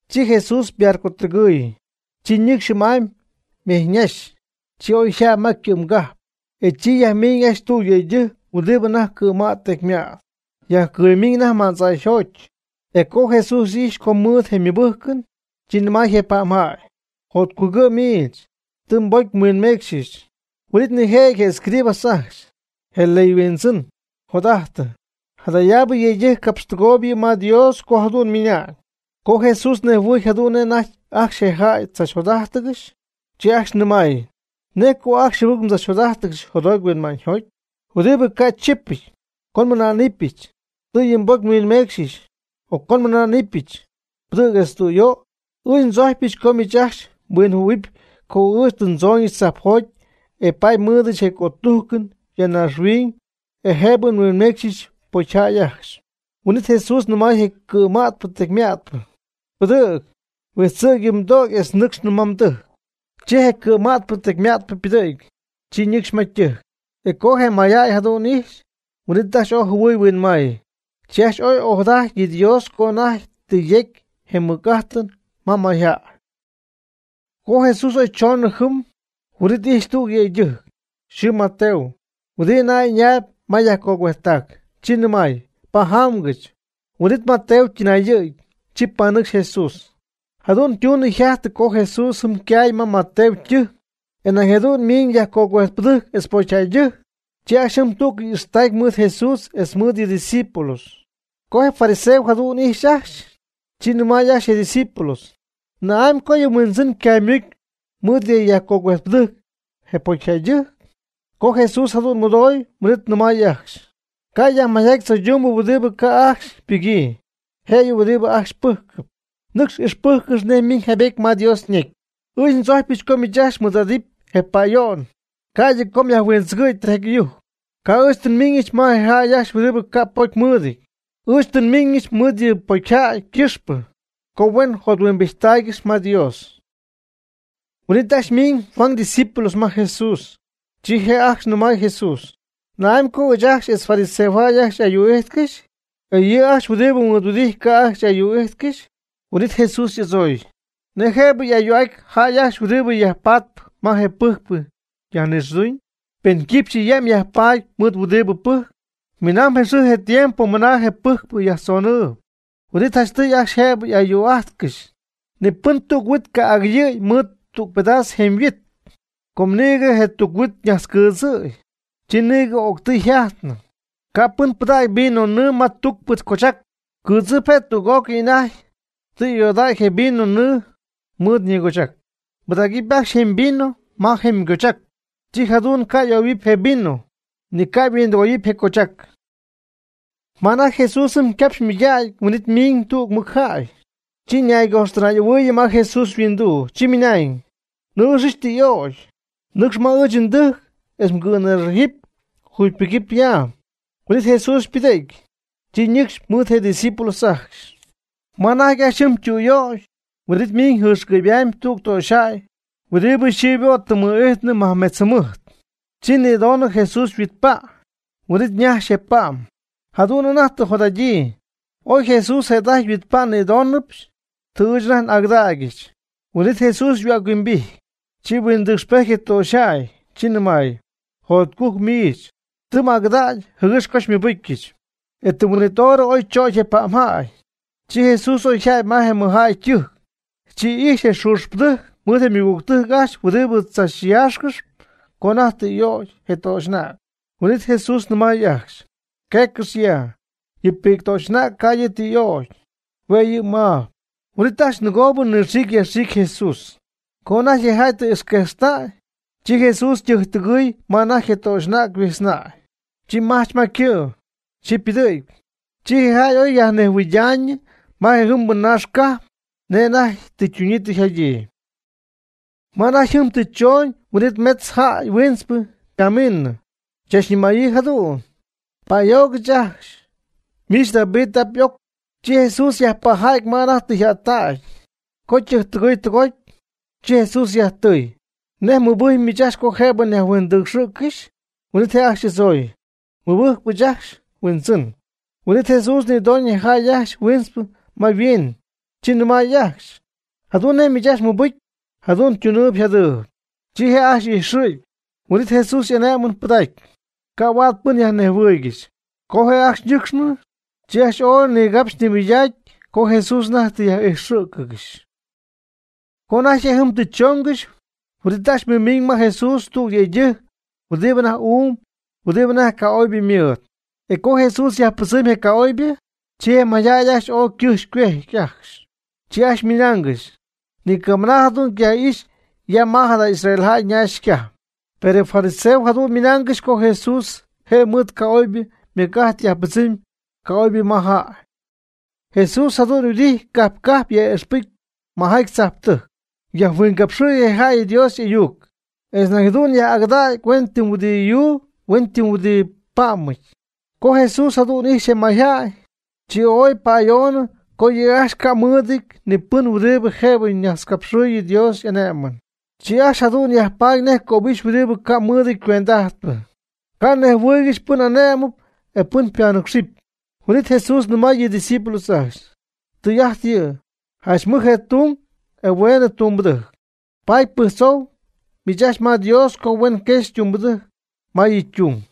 Chi Jesús ybarcɨtɨgɨɨy. Chi ñɨcxy jɨm'amy mejyñaxy. Chi oyjäty ma ycɨ'mgajp. E jɨm yajmɨmiñ tüg yëydɨjc huɨdibɨ anajty cɨ̈mät tecymät. Yajcɨɨy ymiñ ma'ndzaayjoty. E co Jesús ijxy co ymɨɨd je mɨbɨjcɨn, chi nɨmay je pa'mjäy: ―Jotcugɨ' miich, tɨ je mbocy nhuinmeecxyɨch. Huin'it nijëjɨty je escribas ajcxy, je ley yhuindzɨn, jot'ajtɨ: “Jadayaabɨ yëydɨjc capxtɨgooyb yɨ' ma Dios co jadu'n ymɨna'ñ.” Com Jesús ñejhuɨɨy jadu'n nej anajty ajcxy je jäy tzachjot'ájtɨgɨxy, chi ajcxy nɨmay: ―¿Nej co ajcxy jɨbɨc mdzachjot'ájtɨgɨxy jotjoty huinma'ñyjoty? ¿Huɨdibɨ ca' chipɨty, co nmɨná'ñɨbɨch: “Tɨ yɨ mbocy nhuinmeecxɨch”, o co nmɨná'nɨbɨch: “Pɨdɨ̈g etz tüyöy”? Ɨɨch ndzojcpyɨch co miich ajcxy mhuinjɨhuɨ̈huɨp co ɨɨch tɨ ndzooñɨch tzajpjoty e paady nmɨɨdɨch je cötujcɨn ya naaxhuiñ e jëbɨ nhuinméecxɨbɨch pocyjäy ajcxy. Huin'it Jesús nɨmay je cɨ̈mätpɨ tecymätpɨ: ―Pɨdɨ̈g, huijtzɨ̈g yɨ mdögy etz nɨcxnɨ ma mdɨjc. Chi je cɨ̈mätpɨ tecymätpɨ ypɨdɨ̈gy. Chi ñɨcxy ma ytɨjc. E co je mayjäy jadu'n ijxy, huin'it ajcxy ooy jɨhuɨɨy huinmay. Chi ajcxy ooy ojadaty yɨ Dios co anajty tɨ yecy je mɨc'ajtɨn ma mayjäy. Co Jesús oy choonɨ jɨm, huin'it ijxy tüg yëydɨjc, yxɨɨ Mateo, huɨdibɨ anajty ɨñaayb ma yajcogüejttac. Chi nɨmay: ―Pajamgɨch. Huin'it Mateo ytɨnayɨ̈gy. Chi panɨcxy Jesús. Jadu'n ytunɨ yjajtɨ co Jesús jɨm ycay ma Mateo ytɨjc, e may nañ jadu'n ymiñ yajcogüejtpɨdɨjc etz pocyjäydɨjc. Chi ajcxy jɨm tú'cɨy y'ixtactay mɨɨd Jesús etz mɨɨd yɨ' ydiscípulos. Co je fariseos jadu'n ijxy ajcxy, chi nɨmay ajcxy je' ydiscípulos: ―¿Na'amy co yɨ mHuindzɨn ycaymucy mɨɨd je yajcogüejtpɨdɨjc je pocyjäydɨjc? Co Jesús jadu'n mɨdooy huin'it nɨmay ajcxy: ―Ca' yajmayjaty tzoydumbɨ huɨdi ca' ajcxy ypɨgyii, jëyɨ huɨdi ajcxy pɨjcɨp. Nɨcx ixpɨjccɨxy nej ymiñ jaaybety ma Dios ñecy: “Ɨɨch ndzojcpyɨch co miich ajcxy mɨɨd'adɨpy je pa'ayo'n, ca'ydɨ co myajhuindzɨgɨ̈y tijaty ɨyujc.” Ca' ɨɨch tɨ nmiiñɨch ma je jäy ajcxy huɨdibɨ ca' pocy mɨɨdɨty. Ɨɨch tɨ nmiiñɨch mɨɨd yɨ pocyjäy ycɨxpɨ co huen jothuimbijttaaygɨxy ma Dios. Huin'it ajcxy ymiñ Juan ydiscípulos ma Jesús. Chi je ajcxy nɨmay Jesús: ―¿Na'amy co ɨɨch ajcxy etz fariseo ajcxy ayuu'ijtcɨxy, e yɨ' ajcxy huɨdibɨ xymɨɨdhuɨdijtp ca' ajcxy ayuu'íjtcɨxy? Huin'it Jesús y'adzooy: ―¿Nej jëbɨ yaj'ayuu'aty jäy ajcxy huɨdi yajpaatpɨ ma je pɨjcpɨ yajnixɨɨduñyɨ, pen quipxyɨ yam yajpaady mɨɨd je huɨdibɨ pɨjcp? Minamb je xɨɨ je tiempo mɨna je pɨjcpɨ yajtzonɨɨyb, huin'it janchtɨy ajcxy jëbɨ y'ayuu'ajtcɨxy. Ni pɨn tuc huit ca' agɨyɨɨy mɨɨd tüg pedas jemyhuit, com nïgɨ je tuc huit ñajtzcɨɨdzɨ̈y, chi nïgɨ o'ctɨy yjajtnɨ. Ca' pɨn pɨdägy vino nɨɨ ma tucpɨ cochac, ycɨɨdzɨp je', e tüg'ócɨy anajty tɨ y'ayoodäy je vino nɨɨ mɨɨd ñigochac. Pɨdägɨpy ajcxy jemy vino ma jemy cochac, chi jadu'n ca' ayoohuɨpy je vino, ni huindɨgoyɨpy je cochac. Ma anajty Jesús jɨm ycapxy ymɨydägy huin'it ymiñ tüg mɨjjäy. Chi ñaygojxtɨnay'ahuɨy ma Jesús yhuinduu. Chi ymɨnañ: ―Nnɨɨxɨch tɨ y'ögy. Nɨcx ma ɨɨch ndɨjc etz mgɨ̈nïxajɨpy, jugypɨgɨpy ya. Huin'it Jesús ypɨdɨ̈gy. Chi ñɨcxy mɨɨd je ydiscípulos ajcxy. Ma anajty ajcxy jɨm ytüyöy huin'it ymiñ jɨxcɨ'py'amy tüg töxyjäy huɨdi yxɨɨ ybo' tɨ mɨ'ijtɨɨyñɨ majmetz jɨmɨjt. Chi nïdonɨ Jesús yhuitpa'. Huin'it ñajxy je' ypa'm. Jadu'n anajty tɨ yjot'adyii: “Oy Jesús jëda'ajty yhuitpa' nnïdónɨbɨch, tɨ ɨɨch anajty n'agɨdäygɨch.” Huin'it Jesús yhuäc-huimbijty. Chi huindɨcxpejty je töxyjäy. Chi nɨmay: ―Jotcujc'at miich, tɨ m'agɨdägy jɨgɨx co xymɨbɨcyɨch. E tɨm huin'it hora oychögy je pa'mjäy. Chi Jesús oy yjäty ma je mɨjjäy ytɨjc. Chi ijxy je xuuxpɨdɨjc mɨɨd je ymɨgügtɨjc ajcxy huɨdi chachyaaxcɨxy co anajty tɨ y'ögy je töxy'anäg. Huin'it Jesús nɨmay ajcxy: ―Queccɨx ya, yɨ pi'ctöxy'anäg ca' yɨ' tɨ y'ögy. Hue' yɨ' maab. Huin'it ajcxy nɨgo nɨxiicy yajxiicy Jesús. Co anajty je jäy tɨ ixquejxtäy, chi Jesús ytɨjctɨgɨɨy ma anajty je töxy'anäg huijtznäy. Chi majch ma ycɨ'. Chi ypɨdɨ̈gy. Chi je jäy oy yajnejhuɨɨydaayñɨ ma je jɨmbɨ naax cajp nej anajty tɨ ytuñyii tɨ yjadyii. Ma anajty jɨm tɨ choñ huin'it metz jäy huintzpɨ ypamiinɨ. Chachñɨmäyii jadu'n: ―¡Pa'ayoogɨch ajcxy, miich David y'ap y'oc! Chi Jesús yajpajäty ma anajty tɨ yjättägy. Co ytɨgɨɨy tɨgoty, chi Jesús yajtɨɨy: ―¿Nej mmɨbɨjcpy miich ajcxy co jëbɨ nyajhuindɨcxɨ̈ccɨxy? Huin'it je' ajcxy y'adzooy: ―Mɨbɨjcy ɨɨch ajcxy, Huindzɨn. Huin'it Jesús nïdoñ je jäy ajcxy huintzpɨ ma yhuiin. Chi nɨmay ajcxy: ―Jadu'n nej miich ajcxy mmɨbɨcy, jadu'n ytunɨɨb yjadɨɨb. Chi je' ajcxy y'ijxɨ̈gy. Huin'it Jesús y'ane'mɨn pɨdacy: ―Ca' huaad pɨn myajnejhuɨɨygɨxy. Co je' ajcxy ñɨcxnɨ, chi ajcxy ooy nigapxy nimɨydacy co Jesús anajty tɨ yaj'ijxɨ̈cɨgɨxy. Co anajty je' jɨm tɨ chongɨxy, huin'it ajcxy mɨmiñ ma Jesús tüg yëydɨjc huɨdibɨ uum huɨdibɨ anajty ca'oybɨ mɨɨd. E co Jesús yajpɨdzɨmy je ca'oybɨ, chi je mayjäy ooy ycɨjxy ycuejty ajcxy. Chi ajcxy mɨnaangɨxy: ―Ni camɨna jadu'n ycayaj'ixy ya ma jada Israel naax cajp. Per je fariseos jadu'n ymɨnaangɨxy co Jesús je' mɨɨd je ca'oybɨ ymɨc'ajt yajpɨdzɨmy ca'oybɨ ma jäy. Jesús jadu'n yhuɨdijty cajp cajp yaj'ixpɨjcy majaty tzajptɨjc. Yajhuingapxɨ̈y je jäy Dios y'ayuc. Etz nañ jadu'n yaj'agɨdacy huen ytɨm huɨdi yuu huen ytɨm huɨdi pa'mɨty. Co Jesús jadu'n ijxy je mayjäy, chi oy pa'ayoonɨ co yɨ' ajcxy ca' mɨɨdɨty ni pɨn huɨdibɨ jëbɨ ñajtzcapxɨ̈y Dios y'ane'mɨn. Yɨ' ajcxy jadu'n yajpatp nej cöbixy huɨdi ca mɨɨdɨty cuend'ajtpɨ. Ca' nejhuɨɨygɨxy pɨn y'ane'mɨp e pɨn ypanɨcxɨp. Huin'it Jesús nɨmay yɨ' ydiscípulos ajcxy: ―Tɨy'ajt yɨ', janch mɨj je tung e hueenɨ je tumbɨdɨjc. Paady pɨjctzou miich ajcxy ma Dios co huen quexy tumbɨdɨjc ma yɨ' ytung.